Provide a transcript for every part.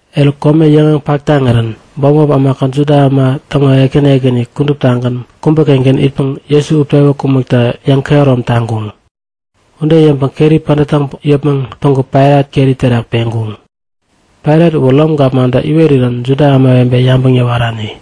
Eruk, kome yäŋeŋ pak taŋirän bämop ämakät Juda täŋo ekäni ekäni kuduptagän kubä-kengän itkaŋ Jesu utpewä kumbekta yäŋkehärom taŋkuŋ. Ude yäŋpäŋ keri pädät täŋpäŋ yäpmäŋ päŋku Pailat keri terak peŋkuŋ. (Pailat uwä Rom gapmantä iwerirän Juda ämawebe yabäŋ yäwarani.)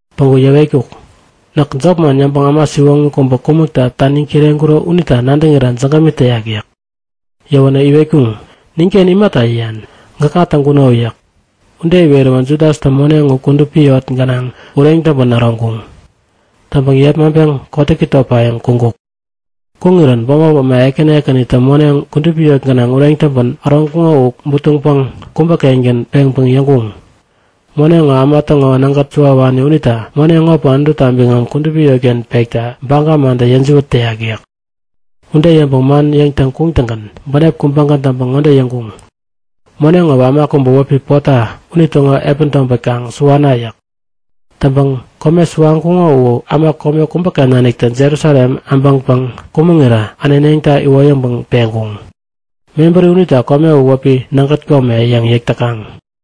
Päŋku yäwetkuk; Näk jopman yäŋpäŋ äma siwoŋi kubä kumäkta taniŋ kireŋkuro unita nadäŋira jägämi täyak yäk. Yäwänä iwetkuŋ; Ninken imata yäyan? Gäkŋa täŋkuno yäk. Ude iweräwä Judastä moneŋ u kudupi yot gänaŋ ureŋ täŋpän äroŋkuŋ. Täŋpäŋ yepmaŋpeŋ kotäki topayäŋ kuŋkuk. Kuŋirän bämop äma ekäni ekänitä moneŋ kudupi yot gänaŋ ureŋ täŋpän äroŋkuŋo u butuŋpäŋ kubä-kengän peŋpäŋ yäŋkuŋ; Moneŋ ŋo äma täŋo nägät suwawani unita moneŋ ŋopäŋ Anututa biŋam kudupi yotken pekta baga mantä yäjiwät täyak yäk. Ude yäŋpäŋ man yäŋtäŋ kuŋtäŋgän bänep kubägän täŋpäŋ ŋode yäŋkuŋ; Moneŋ ŋowä äma kubä wäpi Pota unitäŋo epän tobät kaŋ suwana yäk. Täŋpäŋ kome suwaŋkuŋo u äma kome kubäken nanik Jerusalem äbäŋpäŋ kumäŋirä äneneŋta iwoyäŋpäŋ peŋkuŋ. Mebäri unita kome u wäpi “Nägät Kome” yäŋ yäk täkaŋ.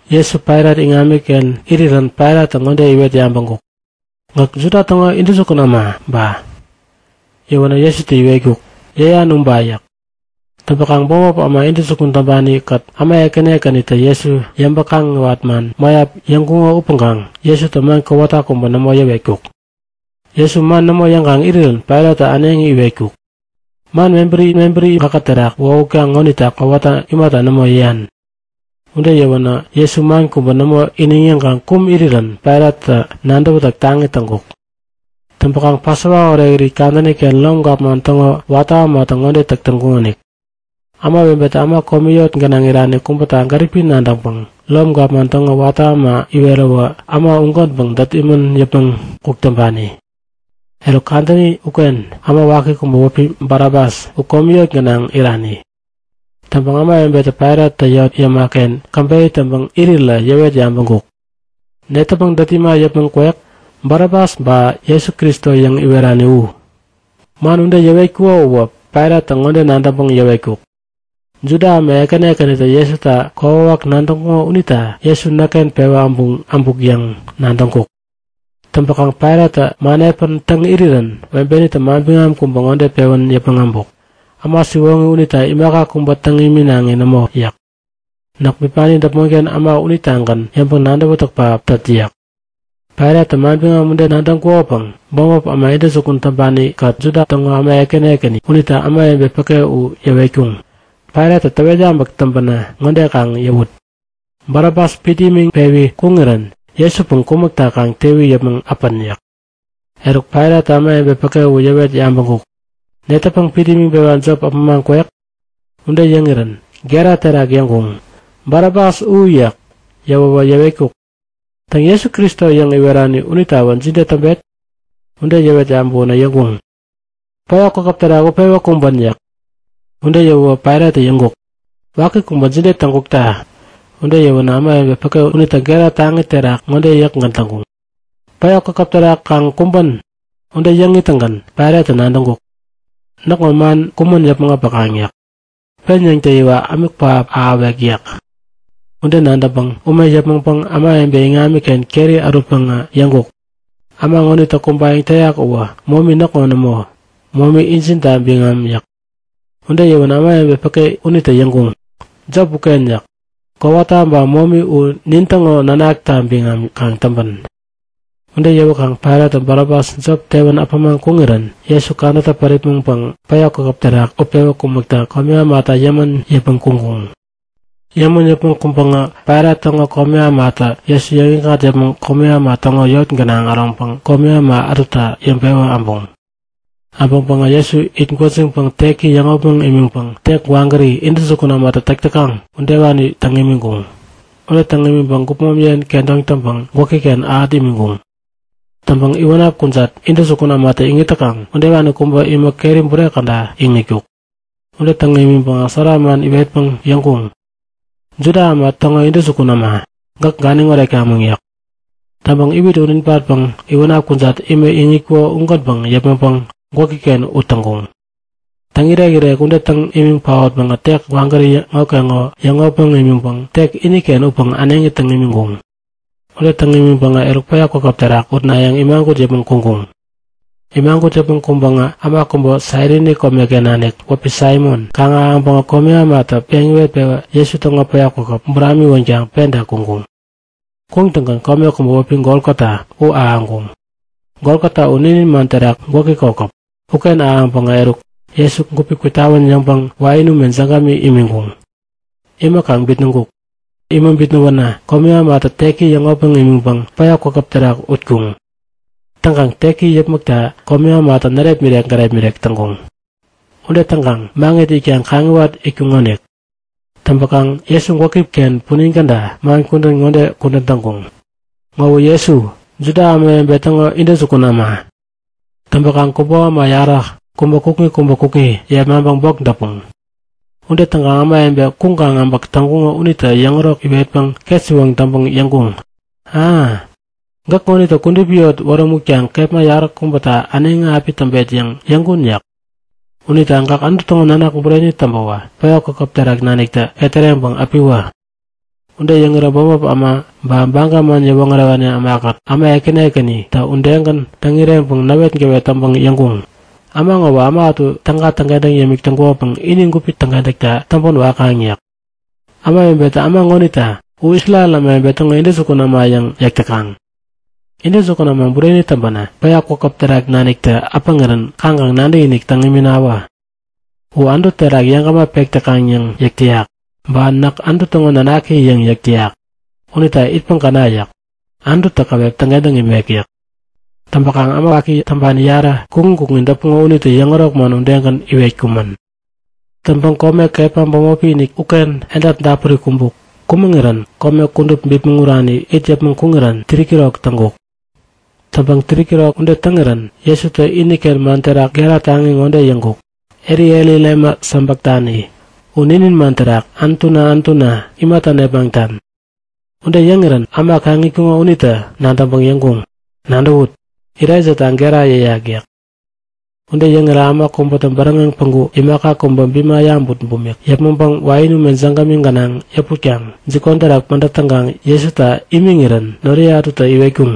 Jesu Pailat iŋamiken irirän Pailattä ŋode iwet yabäŋkuk; Gäk Juda täŋo intäjukun äma ba? Yäwänä Jesutä iwetkuk; Yäyan uba yäk. Täŋpäkaŋ bämop äma intäjukun täŋpani-kät äma ekäni ekänitä Jesu yäŋpäŋ-kaŋiwat man mäyap yäŋkuŋo upäŋkaŋ Jesutä man kowata kubä nämo yäwetkuk. Jesu man nämo yäŋkaŋ irirän Pailattä äneŋi iwetkuk; Man mebäri mebäri gäkä terak wohutkaŋ ŋonita kowata imata nämo yäyan? Ude yäwänä Jesu man kubä nämo iniŋ yäŋkaŋ kum irirän Pailattä nadäwätäk taŋi täŋkuk. Täŋpäkaŋ Pasova Orekirit kadäni-ken Rom gapman täŋo watä ämatä ŋode täk täkaŋonik; Ämawebetä äma komi yot gänaŋ irani kubäta gäripi nadäŋpäŋ Rom gapman täŋo watä äma iweräwä äma ugänpäŋ dät imän yäpmäŋ kuk täŋpani. Eruk, kadäni uken äma waki kubä wäpi Barabas u komi yot gänaŋ irani. Täŋpäŋ ämawebe Pailattä yot yäma-ken käbeyä täŋpäŋ irirä yäwet yabäŋkuk; Netäpäŋ dät ima äpämaŋ kwek? Barabas ba Jesu, Kristo yäŋ iwerani u? (Man ude yäwetkuko uwä Pailattä ŋode nadäŋpäŋ yäwetkuk; Juda äma ekäni ekänitä Jesuta kokwawak nadäŋkuŋo unita Jesu näkken pewä äbuk yäŋ nadäŋkuk.) Täŋpäkaŋ Pailattä man epän täŋ irirän webenitä manbiŋam kubä ŋode pewän yäpmäŋ äbuk; Äma siwoŋi unita imaka kubä täŋ iminaŋi nämo yäk. Näk bipani däpmonken äma unitagän yäŋpäŋ nadäwätäk pähap tät yäk. Pailattä manbiŋam ude nadäŋkukopäŋ bämop äma intäjukun täŋpani-kät Juda täŋo äma ekäni ekäni unitä ämawebe päke u yäwetkuŋ; Pailattä täwet yabäk täŋpänä ŋode kaŋ yäwut; Barabas pit imiŋ pewi kuŋirän Jesupäŋ kumäkta kaŋ tewi yäpmäŋ äpän yäk. Eruk Pailattä ämawebe päke u yäwet yabäŋkuk; Netäpäŋ pit imiŋpewa jop äpämaŋ kwek? Ude yäŋirän gera terak yäŋkuŋ; Barabas u! yäk. Yäwäwä yäwetkuk; Täŋ, Jesu, Kristo yäŋ iwerani unitawä jide täŋpet? Ude yäwet yabäwänä yäŋkuŋ; Päya kwakäp terak utpewä kumbän! yäk. Ude yäwäwä Pailattä yäŋkuk; Waki kubä jide täŋkukta? Ude yäwänä ämawebe päke unitä gera taŋi terak ŋode yäkgän täŋkuŋ; Päya kwakäp terak kaŋ kumbän! Ude yäŋ ittäŋgän Pailattä nadäŋkuk; Näkŋo man kumän yäpmäŋ äpäkaŋ yäk. Pen yäŋtäyiwa ämik pähap ahäwek yäk. Ude nadäŋpäŋä ume yäpmäŋpäŋ ämawebe iŋamiken keri ärutpäŋä yäŋkuk; Äma ŋonitä kumbayäŋ täyak uwä momi näkŋo nämo. Momi injinta biŋam yäk. Ude yäwänä ämawebe päke unitä yäŋkuŋ; Jop uken yäk. Kowata ba momi u ninkät nintäŋo nanakta biŋam kaŋ täŋpän! Ude yäwäkaŋ Pailattä Barabas jop tewän äpämaŋ kuŋirän Jesu kadätä päripmäŋpäŋ päya kwakäp terak utpewä kumäkta komi ämata yämän yäpmäŋ kuŋkuŋ. Yämän yäpmäŋ kuŋpäŋä Pailat täŋo komi ämatä Jesu yäŋikŋat yäpmäŋ komi äma täŋo yot gänaŋ äroŋpäŋ komi äma ätuta yäŋpewä äbuŋ. Äbäŋpäŋä Jesu it gwäjiŋpäŋ teki yäŋopmäŋ imiŋpäŋä tek gwagäri intäjukun ämatä täk täkaŋ udewani täŋ imiŋkuŋ. Ude täŋ imiŋpäŋ gupmom yen kedoŋ täŋpäŋ gwäki-ken ähät imiŋkuŋ. Täŋpäŋ iwänap kujat, intäjukun ämatä iŋit täkaŋ udewani kubä imä keri bure käda iŋitkuk. Ude täŋ imiŋpäŋä sära man iwetpäŋ yäŋkuŋ; Juda täŋo intäjukun äma, gäk ganiŋ oretkamäŋ! yäk. Täŋpäŋ iwit ut ibatpäŋ iwänap kujat imä iŋitkuko ugänpäŋ yäpmäŋpäŋ gwäki-ken ut täŋkuŋ. Täŋirek-irek ude täŋ imiŋ paotpäŋä tek gwagäri ŋokeŋo yäŋopmäŋ imiŋpäŋ tek iniken upäŋ äneŋi täŋ imiŋkuŋ. Ude täŋ imiŋpäŋä, eruk päya kwakäp terak utnayäŋ imagut yäpmäŋ kuŋkuŋ. Imagut yäpmäŋ kuŋpäŋä äma kubä Sairini komeken nanik wäpi Saimon kaŋ-ahäŋpäŋä komi ämatä peŋ iwet-pewä Jesu täŋo päya kwakäp buramiwänkaŋ penta kuŋkuŋ. Kuŋtäŋgän kome kubä wäpi Golgota uken ahäŋkuŋ. (Golgota u ninin man terak gwäki kokäp.) Uken ahäŋpäŋä eruk, Jesu gupi kwitawän yäŋpäŋ wain ume jägämi imiŋkuŋ. Imäkaŋ bitnäŋkuk. Imä bitnäwänä komi ämatä teki yäŋopmäŋ imiŋpäŋ päya kwakäp terak utkuŋ. Täŋkaŋ teki yäpmäkta komi ämatä närepmirek gärepmirek täŋkuŋ. Ude täŋkaŋ maŋit itkaŋ kaŋiwat itkuŋonik. Täŋpäkaŋ Jesu gwäki-ken punin käda man kudän ŋode kudän täŋkuŋ; Ŋowä Jesu, Juda Ämawebe Täŋo Intäjukun Äma. Täŋpäkaŋ kubo äma yarä, kubä kukŋi kubä kukŋi yepmaŋpäŋ bok däpuŋ. Ude täŋkaŋ ämawebe kuŋkaŋ äbäk täŋkuŋo unitä yäŋärok iwetpäŋ ketsiwoŋ täŋpäŋ yäŋkuŋ; A! Gäk ŋonitä kudupi yot wärämutkaŋ kepma yaräkubäta äneŋi api täŋpet yäŋ yäŋkun yäk. Unita gäk Anutu täŋo nanak bureni täŋpäwä päya kwakäp terak naniktä ketäreŋpäŋ äpiwä! Ude yäŋirä bämop äma ba Baga man yäwoŋärewani ämakät äma ekäni ekänitä udegän täŋ-ireŋpäŋ näwetgäwet täŋpäŋ yäŋkuŋ; Äma ŋowä äma ätu täga täŋkentäŋ yämik täŋkukopäŋ ini gupi täŋkentäktawä täŋpän wakaŋ yäk. Ämawebetä äma ŋonita U Isrel ämawebe täŋo intäjukun äma yäŋ yäk täkaŋ. Intäjukun äma bureni täŋpänä päya kwakäp terak naniktä äpäŋirän kaŋkaŋ nadäkinik täŋ iminawä! U Anutu terak yeŋgäma pek täkaŋ yäŋ yäk täyak, ba Näk Anutu täŋo nanaki yäŋ yäk täyak unita itpäŋ käna yäk. Anututä käwep täŋkentäŋ imek yäk. Täŋpäkaŋ äma waki täŋpani yarä, kukŋi kukŋi däpuŋo unitä yäŋärok man udegän iwetkumän. Täŋpäŋ kome kepma bämopi-inik uken edap dapuri kumbuk. Kumäŋirän kome kudup bipmäŋ urani it yäpmäŋ kuŋirän 3'kirok täŋkuk. Täŋpäŋ 3'kirok ude täŋirän Jesutä iniken man terak gera taŋi ŋode yäŋkuk; Eli, Eli, lema sabaktani? (U ninin man terak Anutuna, Anutuna imata nepmaŋtan?) Ude yäŋirän äma kaŋ itkuŋo unitä nadäŋpäŋ yäŋkuŋ; Nadäwut! Elaijata gera yäyak yäk. Ude yäŋirä äma kubätä bäräŋeŋ päŋku imaka kubä bima yabut bumik yäpmäŋpäŋ wain ume jägämi gänaŋ yäputpäŋ jikon terak pädät täŋkaŋ Jesuta imiŋirän noriye ätutä iwetkuŋ;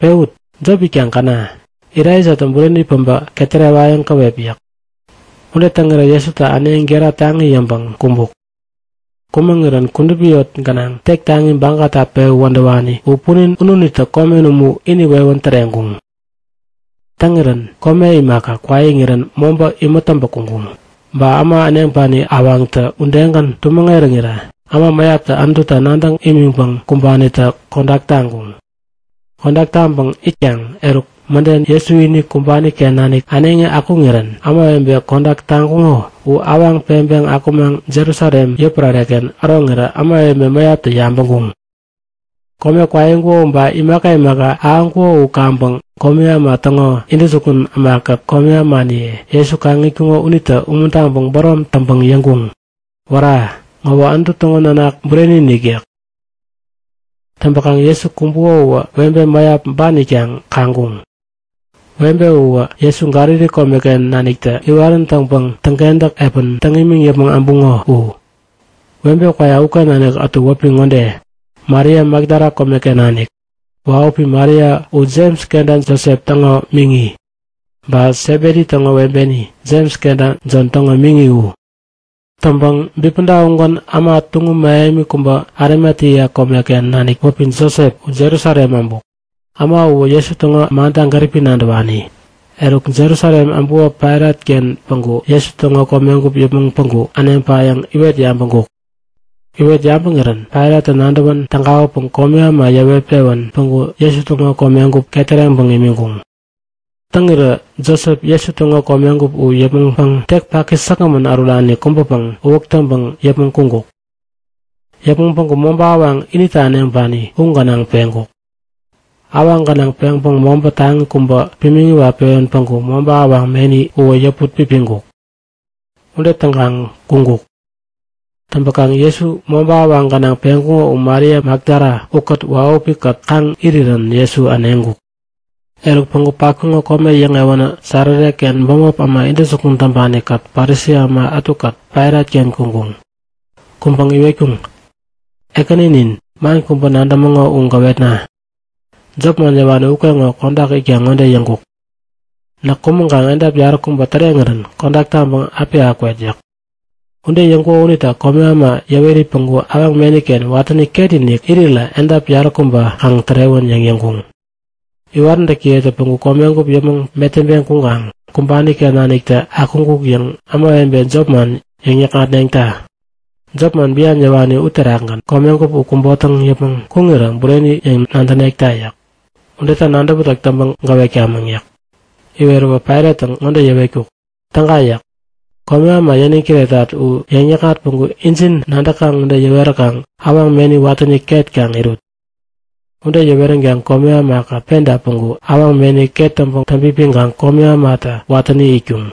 Pewut! Jop itpäŋ käna. Elaijatä bureni päbä ketärewayäŋ käwep yäk. Ude täŋirä Jesu äneŋi gera taŋi yäŋpäŋ kumbuk. Kumäŋirän kudupi yot gänaŋ tek taŋi bagata pewä wädäwani u punin ununitä komen umu ini wewän täreŋkuŋ. Täŋirän kome imaka, kwaiŋirän mobä imät täŋpä kuŋkuŋ. Ba äma äneŋpani awaŋtä udegän tumäŋ eräŋirä äma mäyap Anututa nadäŋ imiŋpäŋ kumbanitä kodak taŋkuŋ. Kodak täŋpäŋ itkaŋ eruk mäden Jesu ini kumbani-ken nanik äneŋi akuŋirän ämawebe kodak taŋkuŋo u awaŋ peŋpeŋ akumaŋ Jerusalem yotpärare-ken äroŋirä ämawebe mäyaptä yabäŋkuŋ. Kome kwaiŋkuko ba imaka imaka ahäŋkuko u kaŋpäŋ komi äma täŋo intäjukun ämakät komi ämaniye Jesu kaŋ itkuŋo unitä umuntaŋpäŋ bärom täŋpäŋ yäŋkuŋ; Wära! Ŋowä Anutu täŋo nanak bureni-inik! yäk. Täŋpäkaŋ Jesu kumbukowä webe mäyap ban itkaŋ kaŋkuŋ. Webe uwä Jesu Galili komeken naniktä iwarän täŋpäŋ täŋkentäk epän täŋ imiŋ yäpmäŋ äbuŋo u. Webe kwayak uken nanik ätu wäpi ŋode; Maria Makdala komeken nanik, wahupi Maria u Jems kenta Josep täŋo miŋi, ba Sebedi täŋo webeni, Jems kenta Jon täŋo miŋi u. Täŋpäŋ bipäda ugän äma tuŋum mähemi kubä Arimatea komeken nanik wäpi Josep u Jerusalem äbuk. Äma uwä Jesu täŋo manta gäripi nadäwani. Eruk Jerusalem äbuko Pailat-ken päŋku Jesu täŋo komegup yäpmäŋ päŋku äneŋpayäŋ iwet yabäŋkuk. Iwet yabäŋirän Pailattä nadäwän tägawäpäŋ komi äma yäwet-pewän päŋku Jesu täŋo komegup ketäreŋpäŋ imiŋkuŋ. Täŋirä Josep Jesu täŋo komegup u yäpmäŋpäŋ tek paki säkgämän ärurani kubäpäŋ uwäk täŋpäŋ yäpmäŋ kuŋkuk. Yäpmäŋ päŋku mobä awaŋ inita äneŋpani u gänaŋ peŋkuk. Awaŋ gänaŋ peŋpäŋ mobä taŋi kubä pimiŋ iwat-pewän päŋku mobä awaŋ meni uwä yäput pipiŋkuk. Ude täŋkaŋ kuŋkuk. Täŋpäkaŋ Jesu mobä awaŋ gänaŋ peŋkuko u Maria Makdala ukät wahupi-kät kaŋ iwarirän Jesu äneŋkuk. Eruk päŋku patkuŋo kome yäŋewänä Sarare-ken bämop äma intäjukun täŋpani-kät Parisi äma ätukät Pailat-ken kuŋkuŋ. Kuŋpäŋ iwetkuŋ; Ekäninin, man kubä nadämäŋo u gäwetna; Jop man yäwani ukeŋo kodak itkaŋ ŋode yäŋkuk; Näk kumäŋkaŋ edap yaräkubä täreŋirän kodak taŋpäŋ api akwet yäk. Ude yäŋkuko unita komi äma yäweri päŋku awaŋ meni-ken watäni ketinik irirä edap yaräkubä kaŋ tärewän yäŋ yäŋkuŋ. Iwaräntäkiyetä päŋku komegup yäpmäŋ metäŋpeŋ kuŋkaŋ kumbani-ken naniktä akuŋkuk yäŋ ämawebe jopman yäkŋatneŋta! Jop man bian yäwani uterakgän komegup u kubotäŋ yäpmäŋ kuŋirä bureni yäŋ nadänekta yäk. Udeta nadäwätäk täŋpäŋ gäwetkamäŋ yäk. Iweräwä Pailattä ŋode yäwetkuk; Täga yäk. Komi äma yäniŋ kiretat u yäŋ-yäkŋat päŋku injin nadäkaŋ ude yäweräkaŋ awaŋ meni watäni ket kaŋ irut. Ude yäweränkaŋä komi ämakät penta päŋku awaŋ meni ket täŋpäŋ täŋpipiŋpäŋ komi ämatä watäni itkuŋ.